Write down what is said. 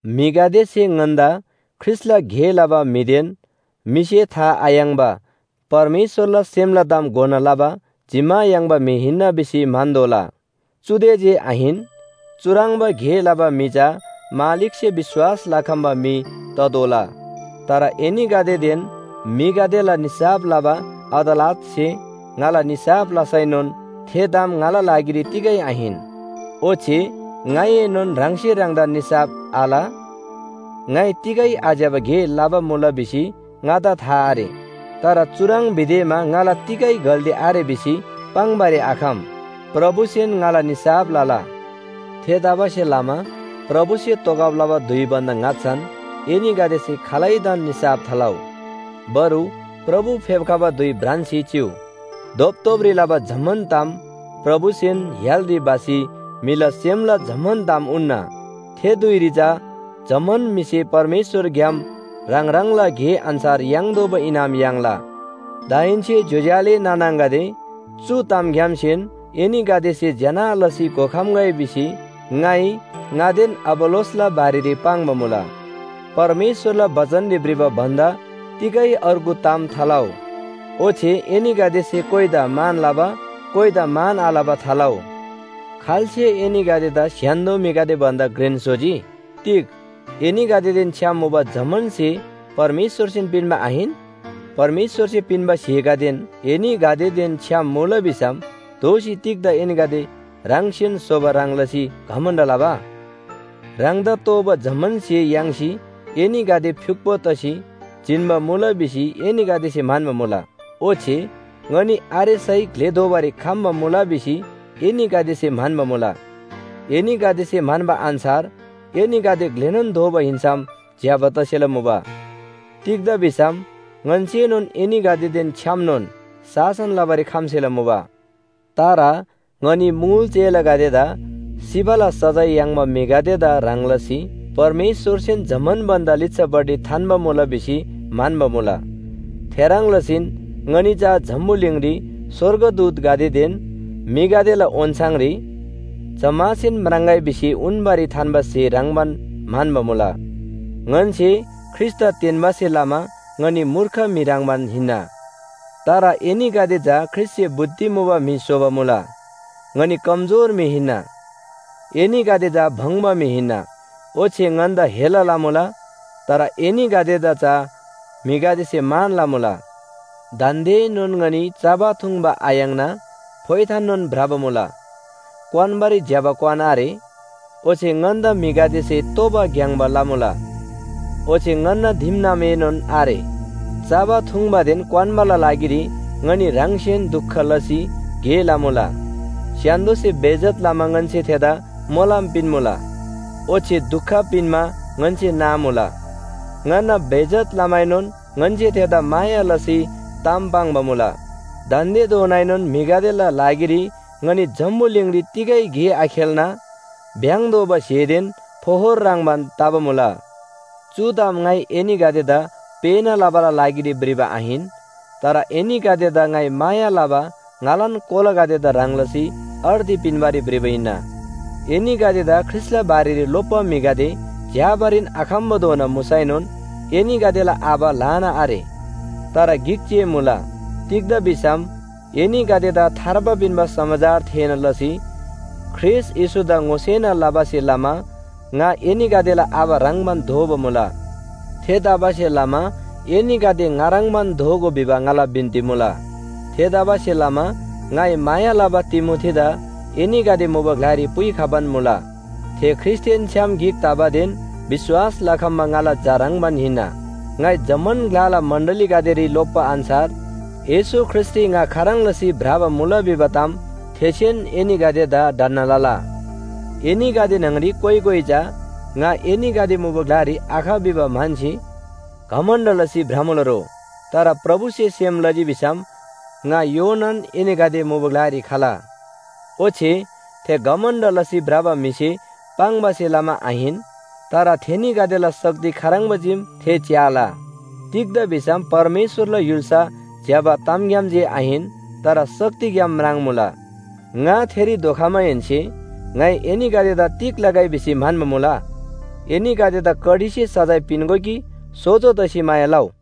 म्‍हिगदेसे ङन्‍दा ख्रीष्‍टला गे लबा म्‍हिदेन म्‍हिसे था आयाङ्‍बा परमेश्‍वरला सेमला ताम घोना लबा जिम्‍मा याङ्बा म्‍हि हिन्‍ना भिसी म्‍हन्‍तोःला। चुदे जे आहिन, चुह्रङ्बा गे लबा म्‍हि चा मालिकसे विश्‍वास लखम्‍बा म्‍हि ततोःला। तर एनीगदेदेन म्‍हिगदेला निसाफ लबा अदालतसे ङाला निसाफ लसैनोन थे ताम ङाला लागिरी तिगै आहिन। ओच्‍छे ङाइएनोन ह्राङसे ह्राङदान निसाफ आल। ङाइ तिगै आज्‍यबा गे लबा मुला भिसी ङादा था आरे, तर चुह्रङ् भिदेमा ङाला तिगै गल्‍ती आरे भिसी पाङ्‌बारी आखम। प्रभुसेन ङाला निसाफ लला। थेतबासेलमा प्रभुसे तोगब लबा धुइ भन्‍दा ङाच्‍छान एनीगदेसे खालैदान निसाफ थालउ। बरु प्रभु फेप्‍खबा धुइ भ्रान्‍सी चिउ। धोपधोपरी लबा जम्‍मान ताम प्रभुसेन य्‍हालरी भसी म्‍हिला सेमला जम्‍मान ताम उन्‍ना। थे धुइरी चा जम्‍मान म्‍हिसे परमेश्‍वरग्‍याम ह्राङ ह्राङला गे अन्‍छार याङ्तोःबा इनाम याङ्ला। दाहेन्‍से ज्‍योज्‍यो आले नाना आङागदे, चु तामग्‍यामसेन एनीगदेसे ज्‍यना लसी घोखम्‍गै भिसी ङाइ ङादेन अपोल्‍लोसला बारेरी पाङ्बा मुला। परमेश्‍वरला बचनरी भ्रिबा भन्‍दा तिगै अर्गु ताम थालउ। ओच्‍छे एनीगदेसे कोइदा मान लबा, कोइदा मान आलबा थालउ। खाल्‍से एनीगदेदा स्‍य्‍हान्‍दो म्‍हिगदे भन्‍दा घ्रेन स्‍होजी? तिग एनीगदेदेन छ्‌याम मुबा जम्‍मान स्‍हे परमेश्‍वरसेन पिन्‍बा आहिन? परमेश्‍वरसे पिन्‍बा स्‍हेगदेन एनीगदेदेन छ्‌याम मुला भिसम दोःसी तिग्‍दा एनीगदे ह्राङसेन स्‍होबा ह्रङ् लसी घमण्‍ड लबा? ह्राङदा तोःबा जम्‍मान स्‍हे याङ्सी एनीगदे फ्‍युक्‍पो तसी जिन्‍बा मुला भिसी एनीगदेसे म्‍हन्‍बा मुला। ओच्‍छे ङनी आरेसै ग्‍ले दोबारी खम्‍बा मुला भिसी एनीगदेसे म्‍हन्‍बा मुला। एनीगदेसे म्‍हन्‍बा अन्‍छार एनीगदे ग्‍लेनोन दोबा हिन्‍सम ज्‍यबा तसेला मुबा। तिग्‍दा भिसम ङन्‍सेनोन एनीगदेदेन छ्‌यामनोन शासन लबारी खम्‍सेला मुबा। तर ङनी मुल चेलागदेदा सिबाला सजाय याङ्बा म्‍हिगदेदा ह्रङ् लसी परमेश्‍वरसेन जम्‍मान भन्‍दा लिच्‍छापट्टि थान्‍बा मुला भिसी म्‍हन्‍बा मुला। थेह्रङ् लसीन ङनी चा जम्‍बुलिङरी स्‍वर्गदूतगदेदेन म्‍हिगदेला ओन्‍छाङरी जम्‍मासेन म्राङ्‍गै भिसी उन्‍बारी थान्‍बा स्‍हे ह्रङ्‌बान म्‍हन्‍बा मुला। ङन्‍से ख्रीष्‍टदा तेन्‍बासे लमा ङनी मूर्ख म्‍हि ह्रङ्‌बान हिन्‍ना, तर एनीगदेदा चा ख्रीष्‍टसे बुद्धि मुबा म्‍हि स्‍होबा मुला। ङनी कमजोर म्‍हि हिन्‍ना, एनीगदे चा भङ्‍बा म्‍हि हिन्‍ना। ओच्‍छे ङन्‍दा हेला लमुला, तर एनीगदेदा चा म्‍हिगदेसे मान लमुला। दान्‍देएनोन ङनी चबा थुङ्बा आयाङ्ना फोइथाननोन भ्रबा मुला, क्‍वान्‍बारी ज्‍यबा क्‍वान आरे। ओच्‍छे ङन्‍दा म्‍हिगदेसे तोबा ग्‍याङ्‍बा लबा मुला, ओच्‍छे ङन्‍ना दिमनामएनोन आरे। चबा थुङ्बादेन क्‍वान्‍बाला लागिरी ङनी ह्राङसेन दुख लसी गे लमुला। स्‍य्‍हान्‍दोसे बेइज्‍जत लमा ङन्‍से थेन्‍दा मोलम पिन्‍मुला, ओच्‍छे दुख पिन्‍मा ङन्‍से नामुला। ङन्‍ना बेइज्‍जत लमाएनोन ङन्‍से थेन्‍दा माया लसी ताम पाङ्बा मुला। दान्‍देधोनाएनोन म्‍हिगदेला लागिरी ङनी जम्‍बुलिङरी तिगै गे आखेल्‍ना भ्‍याङ्‌तोःबा स्‍हेदेन फोहोर ह्रङ्‌बान तबा मुला। चु ताम ङाइ एनीगदेदा पेःना लबाला लागिरी भ्रिबा आहिन, तर एनीगदेदा ङाइ माया लबा ङालान कोलागदेदा ह्रङ् लसी अर्ती पिन्‍बारी भ्रिबा हिन्‍ना। एनीगदेदा ख्रीष्‍टला बारेरी लोप्‍बा म्‍हिगदे झ्‍याबारीन आखम्‍बाधोना मुसैनोन एनीगदेला आबा ल्‍हाना आरे, तर गिक जे मुला। तिग्‍दा भिसम एनीगदेदा थार्बा पिन्‍बा समाचार थेःना लसी ख्रीष्‍ट येशूदा ङोसेना लबासे लमा ङा एनीगदेला आबा ह्रङ्‌बान दोबा मुला। थेतबासेलमा एनीगदे ङा ह्रङ्‌बान दोगो भिबा ङाला बिन्‍ती मुला। थेतबासेलमा ङाइ माया लबा तिमोथीदा एनीगदे मुबा ग्‍लारी पुइखबान मुला। थे ख्रीष्‍टदेन छ्‌याम गिक तबादेन विश्‍वास लखम्‍बा ङाला झा ह्रङ्‌बान हिन्‍ना। ङाइ जम्‍मान ग्‍लाला मण्‍डलीगदेरी लोप्‍बा अन्‍छार येशू ख्रीष्‍टरी ङा खाह्रङ् लसी भ्रबा मुला भिबा ताम थेसेन एनीगदेदा ढन्‍ना लला। एनीगदे न्‍हङरी कोइ कोइ चा ङा एनीगदे मुबा ग्‍लारी आख भिबा म्‍हन्‍सी घमण्‍ड लसी भ्रमुला रो, तर प्रभुसे सेम लजी भिसम ङा योनान एनीगदे मुबा ग्‍लारी खला। ओच्‍छे थे घमण्‍ड लसी भ्रबा म्‍हिसे पाङ्बासे लमा आहिन, तर थेनीगदेला शक्ति खाह्रङ्बा चीम थे च्‍याला। तिग्‍दा भिसम परमेश्‍वरला य्‍हुल्‍सा ज्‍यबा तामग्‍याम जे आहिन, तर शक्तिग्‍याम म्राङ्‌मुला। ङा थेरी धोखमाहेन्‍से ङाइ एनीगदेदा तिग लगै भिसी म्‍हन्‍बा मुला? एनीगदेदा कडीसे सजाय पिन्‍गो कि सोजो तसी माया लउ?